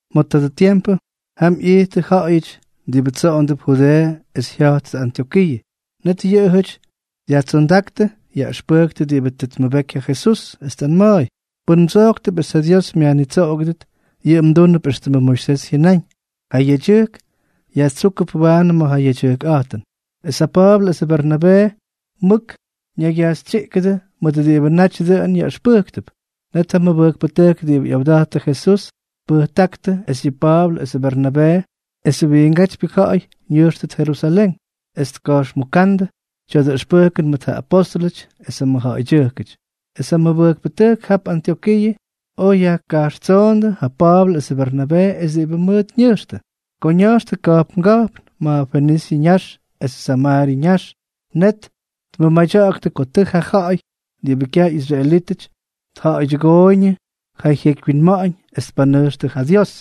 Ma̱ tadʉ tiempʉ, jam ꞌyijttʉ ja̱ꞌa̱yʉty diꞌibʉ tsoꞌondʉp Judeeʉ es jya̱jttʉ Antyokiiʉ. Net yʉꞌʉjʉty dyajtsondáktʉ yaꞌʉxpʉktʉ diꞌibʉ tʉ tmʉbeky ja Jesús, es tꞌanma̱a̱y: —Pʉn mdsojktʉp es ja Dios myajnitsoꞌogʉdʉt, yʉꞌʉ mdúnʉp éxtʉmʉ Moisés jyʉnáñ, ja yedyʉjk yajtsúkʉp waanʉ ma̱ ja yedyʉjkꞌa̱jtʉn. Es ja Pa̱a̱blʉ esʉ Bernabee mʉk ñaygyajxytsyiꞌkʉdʉ mʉt diꞌibʉ naty dʉꞌʉn yaꞌʉxpʉjktʉp. Net ja mʉbʉjkpʉtʉjk diꞌibʉ ꞌyawda̱jttʉ Jesús tpʉjtáktʉ es yʉ Pa̱a̱blʉ esʉ Bernabee es wiingátypyʉ ja̱ꞌa̱y ñʉjxtʉt Jerusalén, es tka̱jxmuka̱ꞌa̱ndʉ tya̱dʉ ʉxpʉjkʉn mʉt ja apóstʉlʉty es ja mʉjja̱ꞌa̱ydyʉjkʉty. Es ja mʉbʉjkpʉtʉjk jap Antyokiiʉ oj yajkajxtsoondʉ ja Pa̱a̱blʉ esʉ Bernabee es diꞌibʉ mʉʉt ñʉjxtʉ. Ko ña̱jxtʉ ka̱jpnga̱jpn ma̱ Fenisyʉ ñax esʉ Samaaryʉ ñax, net tmʉmadyaktʉ ko tʉ ja ja̱ꞌa̱y diꞌibʉ kyaj ꞌyisraelítʉty tja̱ꞌa̱ydyʉgooyñʉ ja jyekywyinma̱ꞌa̱ñ es tpanʉjxtʉ ja Dios.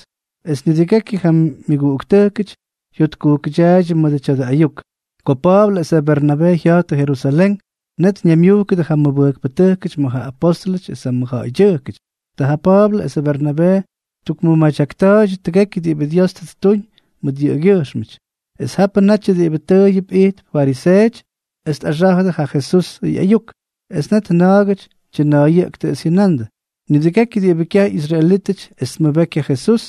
Es nidʉgekyʉ ja myʉguꞌuktʉjk jyotkujkʉdyaaydyʉ mʉdʉ tya̱dʉ ayuk. Ko Pa̱a̱blʉ esʉ Bernabee jya̱jttʉ Jerusalén, net ñaymyujkʉdʉ ja mʉbʉjkpʉtʉjkʉty mʉt ja apóstʉlʉty esʉ mʉjja̱ꞌa̱ydyʉjkʉty. Ta ja Pa̱a̱blʉ esʉ Bernabee ttukmʉmadyakta̱a̱ydyʉ tʉgekyʉ diꞌibʉ Dios tʉ ttuñ mʉt yʉꞌʉgyʉjxmʉty. Es japʉ natyʉ diꞌibʉ tʉʉyʉp ijtp fariseeʉty es tꞌaxa̱jʉ ja Jesusʉ ꞌyayuk, es net na̱a̱gʉty tyʉna̱a̱yʉꞌktʉ es jyʉnandʉ: —Nidʉgekyʉ diꞌibʉ kyaj ꞌyisraelítʉty es tmʉbeky ja Jesús,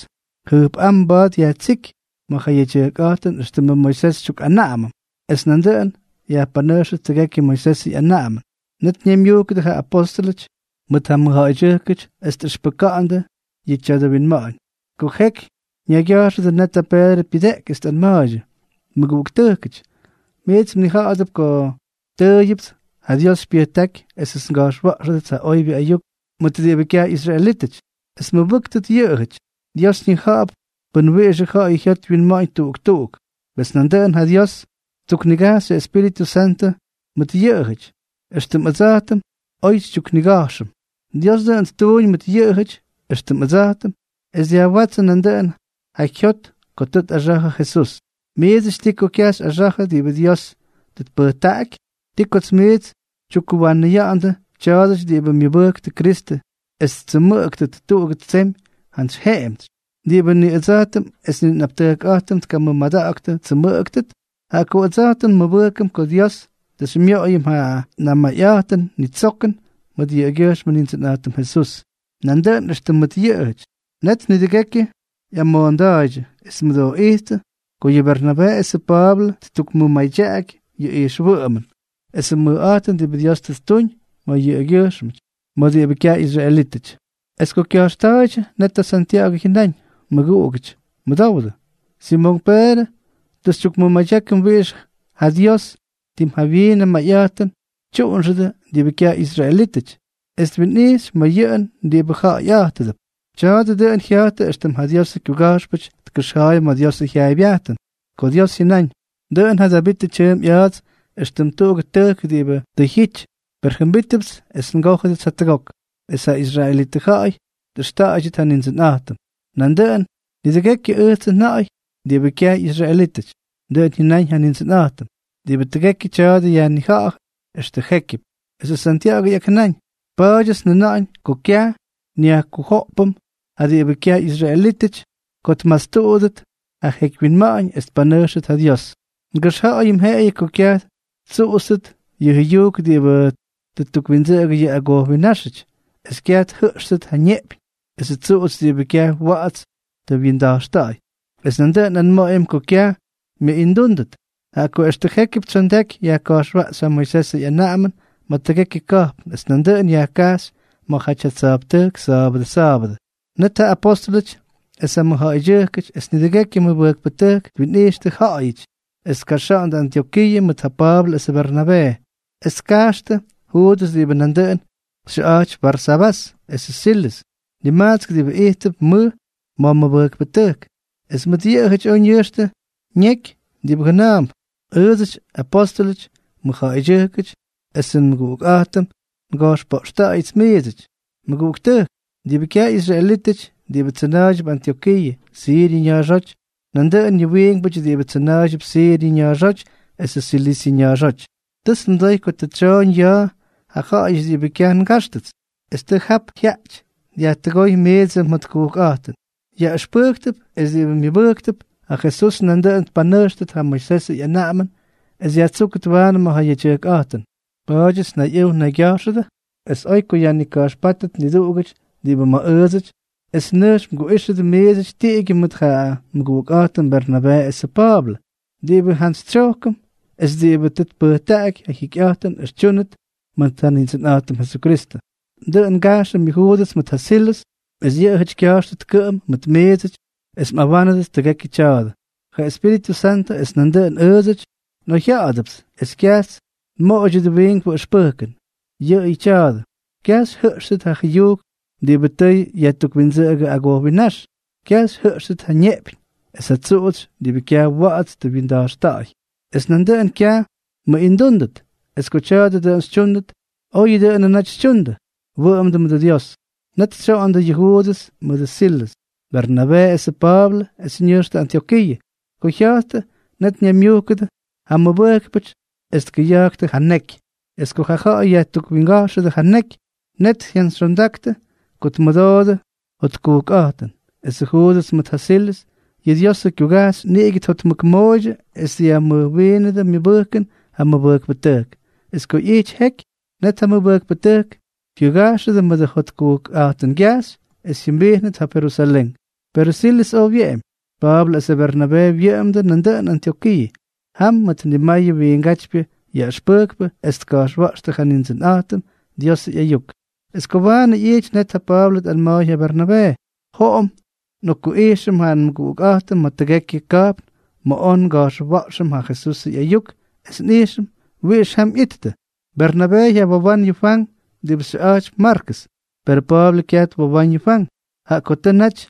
jʉjpꞌám mba̱a̱t yajtsíky ma̱ ja yedyʉjkꞌa̱jtʉn éxtʉmʉ Moisés xytyukꞌanaꞌamʉm, es nandʉꞌʉn yajpanʉjxʉt tʉgekyʉ Moisesʉ ꞌyanaꞌamʉn. Net ñaymyujkʉdʉ ja apóstʉlʉty mʉt ja mʉjja̱ꞌa̱ydyʉjkʉty es tꞌʉxpʉka̱ꞌa̱ndʉ yʉ tya̱dʉ winma̱ꞌa̱ñ. Ko jeky ñaygya̱jxʉdʉ, netʉ Peedrʉ pyʉdeꞌky, es tꞌanma̱a̱ydyʉ: —Mʉguꞌuktʉjkʉty, miits mnija̱ꞌa̱dʉp ko tʉʉyʉpts ja Dios xypyʉjtáky esʉts nga̱jxwa̱ꞌxʉdʉts ja oybyʉ ayuk mʉt diꞌibʉ kyaj ꞌyisraelítʉty, es tmʉbʉ́ktʉt yʉꞌʉjʉty. Dios ñija̱ꞌa̱p pʉn wiꞌixʉ ja̱ꞌa̱y jyot wyinma̱ꞌa̱ñ tuꞌuk tuꞌuk. Pes nandʉꞌʉn ja Dios tyuknigajx ja Espíritʉ Santʉ mʉt yʉꞌʉjʉty, éxtʉm ʉdsa̱jtʉm oj xytyuknigajxʉm. Dios dʉꞌʉn ttuuñ mʉt yʉꞌʉjʉty éxtʉm ʉdsa̱jtʉm, es dyajwátsʉ nandʉꞌʉn ja jyot ko tʉ tꞌaxa̱jʉ Jesús. ¿Miidsʉty ti ko kyaj xyꞌaxa̱jʉ diꞌibʉ Dios tʉ tpʉjtaꞌaky? ¿Ti ko miits xytyukkuwanʉya̱ꞌa̱ndʉ tya̱a̱dʉty diꞌibʉ myʉbʉjktʉ Kristʉ es ttsʉmʉꞌʉktʉt tuꞌugʉ tsemy jantsy jemtsy, diꞌibʉ ni ʉdsa̱jtʉm es ni nꞌaptʉjkꞌa̱jtʉm tkamʉmadaktʉ ttsʉmʉꞌʉgʉt? Jaꞌa ko ʉdsa̱jtʉm nmʉbʉjkʉm ko Dios tʉ xymyoꞌoyʉm ja namayꞌa̱jtʉn nitsokʉn mʉt yʉꞌʉgyʉjxmʉ Nindsʉnꞌa̱jtʉm Jesús, nandʉꞌʉn éxtʉm mʉt yʉꞌʉjʉty. Net nidʉgekyʉ ꞌyamoonda̱a̱ydyʉ es tmʉdooꞌijttʉ ko yʉ Bernabee esʉ Pa̱a̱blʉ ttukmʉmadyaꞌaky yʉ ijxwʉꞌʉmʉn esʉ mʉjꞌa̱jtʉn diꞌibʉ Dios tʉ ttuñ mʉt yʉꞌʉgyʉjxmʉty ma̱ diꞌibʉ kyaj ꞌyisraelítʉty. Es ko kya̱jxta̱a̱ydyʉ, net ja Santya̱ꞌa̱gʉ jyʉnáñ: —Mʉguꞌugʉty, mʉdowdʉ. Simonk Peedrʉ tʉ xytyukmʉmadyákʉm wiꞌix ja Dios tim jawyiin mayꞌa̱jtʉn tyuꞌunxʉdʉ diꞌibʉ kyaj ꞌyisraelítʉty, es twinꞌijxy ma̱ yʉꞌʉn diꞌibʉ ja̱ꞌa̱yꞌátʉdʉp. Tya̱a̱dʉ dʉꞌʉn jya̱jtʉ éxtʉm ja Diosʉ kyuga̱jxpʉty tkʉxja̱a̱y ma̱ Diosʉ jyaaybyajtʉn, ko Dios jyʉnáñ: Dʉꞌʉn ja Davit tyʉʉmp ꞌya̱a̱ts éxtʉm tuꞌugʉ tʉjk diꞌibʉ tʉ jyity, per jʉmbítʉbʉts es ngójʉdʉts jatʉgok, es ja israelitʉ ja̱ꞌa̱y tꞌʉxta̱ꞌa̱ydyʉt ja Nindsʉnꞌa̱jtʉm, nandʉꞌʉn nidʉgekyʉ ʉjtsʉ nja̱ꞌa̱y diꞌibʉ kyaj ꞌyisraelítʉty. Dʉꞌʉn jyʉnáñ ja Nindsʉnꞌa̱jtʉm, diꞌibʉ tʉgekyʉ tya̱a̱dʉ yajnija̱ꞌa̱jʉ extʉ jékyʉp. Esʉ Santya̱ꞌa̱gʉ ꞌyakjʉnáñ: —Pa̱a̱dyʉts njʉna̱ꞌa̱ñ ko kyaj nyajkujoꞌpʉm ja diꞌibʉ kyaj ꞌyisraelítʉty ko tmastuꞌudʉt ja jyeky winma̱ꞌa̱ñ es tpanʉjxtʉt ja Dios. Ngʉxja̱ꞌa̱yʉm jeꞌeyʉ ko kyaj ttsuꞌutstʉt yʉ jʉyujk diꞌibʉ tʉ ttukwindsʉꞌʉgʉ yʉ agojwinnáxʉty, es kyaj tjʉꞌxtʉt ja neꞌpyñ esʉ tsuꞌutsy diꞌibʉ kyaj wa̱ꞌa̱ts tʉ wyinda̱jxta̱ꞌa̱y, es nandʉꞌʉn nꞌanma̱ꞌa̱yʉm ko kyaj myʉꞌindúndʉt. Jaꞌa ko extʉ jékyʉp tsyondaky yajka̱jxwaꞌxy ja Moisesʉ ꞌyanaꞌamʉn ma̱ tʉgekyʉ ka̱jpn, es nandʉꞌʉn yajkajxy ma̱jaty ja tsa̱jptʉjk sa̱a̱bʉdʉ sa̱a̱bʉdʉ. Net ja apostʉlʉty esʉ mʉjja̱ꞌa̱ydyʉjkʉty es nidʉgekyʉ mʉbʉjkpʉtʉjk twinꞌixtʉ ja̱ꞌa̱yʉty es tkaxa̱ꞌa̱ndʉ Antyokiiʉ mʉt ja Pa̱a̱blʉ esʉ Bernabee. Es tkajxtʉ Juudʉs diꞌibʉ nandʉꞌʉn xyʉꞌa̱jtypy Barsabás, esʉ Silʉs, nimajtsk diꞌibʉ ijttʉp mʉj ma̱ mʉbʉjkpʉtʉjk. Es mʉt yʉꞌʉjʉty oj ñʉjxtʉ ñeky diꞌibʉ jʉna̱a̱mp: “Ʉʉdsʉty, apóstʉlʉty, mʉjja̱ꞌa̱ydyʉjkʉty esʉ nmʉguꞌukꞌa̱jtʉm, nga̱jxpoꞌxta̱ꞌa̱yʉts miidsʉty, mʉguꞌuktʉjk diꞌibʉ kyaj ꞌyisraelítʉty, diꞌibʉ tsʉna̱a̱ydyʉp Antyokiiʉ, Siryʉ ña̱a̱xóty, nandʉꞌʉn ja wiinkpʉty diꞌibʉ tsʉna̱a̱ydyʉp Siryʉ ña̱a̱xóty es Silisyʉ ña̱a̱xóty. Tʉts nmʉdoy ko tʉ tsyooñ ya̱a̱ ja ja̱ꞌa̱yʉty diꞌibʉ kyaj ngáxtʉts, es tʉ jap jyaꞌty dyajtʉgóy miidsʉ mjotkujkꞌa̱jtʉn, yaꞌʉxpʉjktʉp es diꞌibʉ myʉbʉjktʉp ja Jesús nandʉꞌʉn tpanʉjxtʉt ja Moisesʉ ꞌyanaꞌamʉn es yajtsúkʉt waanʉ ma̱ ja yedyʉjkꞌa̱jtʉn. Pa̱a̱dyʉts nnayꞌʉw ñaygya̱jxʉdʉ es oy ko yajnika̱jxpátʉt niduꞌugʉty diꞌibʉ ma̱ ʉʉdsʉty es nʉjx mguꞌíxʉdʉ miidsʉty tiꞌigyʉ mʉt ja nmʉguꞌukꞌa̱jtʉm Bernabee esʉ Pa̱a̱blʉ, diꞌibʉ njantsytsyojkʉm es diꞌibʉ tʉ tpʉjtaꞌaky ja jyikyꞌa̱jtʉn es tyúnʉt mʉt ja Nindsʉnꞌa̱jtʉm Jesukristʉ. Dʉꞌʉn ngajxʉm yʉ Juudʉs mʉt ja Silʉs es yʉꞌʉjʉty kya̱jxtʉt kʉꞌʉm mʉt miidsʉty es mꞌawánʉdʉt tʉgekyʉ tya̱a̱dʉ. Ja Espíritʉ Santʉ es nandʉꞌʉn ʉʉdsʉty nꞌoyjya̱ꞌa̱dʉpts es kyajts nmoꞌoydyʉt wiinkpʉ ʉxpʉjkʉn, yʉꞌʉyʉ tya̱a̱dʉ: Kyaj xyjʉꞌxtʉt ja jʉyujk diꞌibʉ tʉ yajtukwindsʉꞌʉgʉ agojwinnáx, kyaj xyjʉꞌxtʉt ja neꞌpyñ es ja tsuꞌutsy diꞌibʉ kyaj wa̱ꞌa̱ts tʉ wyinda̱jxta̱ꞌa̱y, es nandʉꞌʉn kyaj mmʉꞌindúndʉt. Es ko tya̱a̱dʉ dʉꞌʉn xytyúndʉt, oyʉ dʉꞌʉnʉ naty xytyundʉ. Wʉꞌʉmdʉ mʉdʉ Dios.” Net tsyoꞌondʉ yʉ Juudʉs mʉdʉ Silʉs, Bernabee esʉ Pa̱a̱blʉ, es ñʉjxtʉ Antyokiiʉ. Ko jya̱jttʉ, net ñaymyujkʉdʉ ja mʉbʉjkpʉty es tkʉya̱jktʉ ja neky. Es ko ja̱ꞌa̱y yajtukwinguga̱jxʉdʉ ja neky, net jyantsyxyondaktʉ ko tmʉdoodʉ jotkujkꞌa̱jtʉn. Esʉ Juudʉs mʉt ja Silʉs, yʉ Diosʉ kyugajxy, niꞌigʉ tjotmʉkmooydyʉ es dyajmʉjwiinʉdʉ myʉbʉjkʉn ja mʉbʉjkpʉtʉjk. Es ko ꞌyijty jeky, net ja mʉguꞌuktʉjk jyʉga̱jxʉdʉ mʉdʉ jotkujkꞌa̱jtʉngyajxy, es jyʉmbijnʉt jap Jerusalén. Perʉ Silʉs oj wyeꞌemy. Pa̱a̱blʉ esʉ Bernabee wyʉꞌʉmdʉ nandʉꞌʉn Antyokiiʉ. Jam mʉt nimayʉ wiingátypyʉ yaꞌʉxpʉjktʉ es tka̱jxwa̱ꞌxtʉ ja Nindsʉnꞌa̱jtʉm Diosʉ ꞌyayuk. Es ko waanʉ ꞌyijty, net ja Pa̱a̱blʉ tꞌanma̱a̱y ja Bernabee: —Joꞌom nꞌokkuꞌijxʉm ja nmʉguꞌukꞌa̱jtʉm ma̱ tʉgekyʉ ka̱jpn ma̱ oj nga̱jxwa̱ꞌxʉm ja Jesusʉ ꞌyayuk, es nꞌijxʉm wiꞌix jam ꞌyittʉ. Bernabee jyawowán yʉ Fwank diꞌibʉ xyʉꞌa̱jtypy Markʉs. Perʉ Pa̱a̱blʉ kyaj twowáñ yʉ Fwank, jaꞌa ko tʉ naty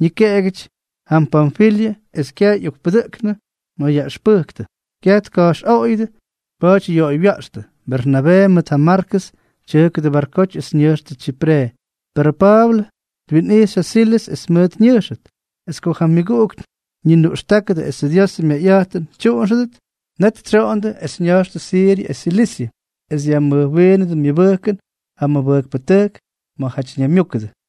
ñikeꞌegyʉty jam Panfilyʉ es kyaj ꞌyokpudʉjkʉnʉ ma̱ yaꞌʉxpʉjktʉ. Kyaj tka̱jxꞌoꞌoyʉdʉ, pa̱a̱ty yoꞌoywya̱ꞌxtʉ. Bernabee mʉt ja Markʉs tyʉjkʉdʉ barkoty es ñʉjxtʉ Tsyipre, per Pa̱a̱blʉ twinꞌijxy ja Silʉs es mʉʉt ñʉjxʉt. Es ko ja myʉguꞌuk ñinuꞌxtákʉdʉ esʉ Dios myayꞌa̱jtʉn tyuꞌunxʉdʉt, net tsyoꞌondʉ, es ña̱jxtʉ Siryʉ es Silisyʉ, es dyajmʉjwiinʉdʉ myʉbʉjkʉn ja mʉbʉjkpʉtʉjk ma̱jaty ñaymyúkʉdʉ.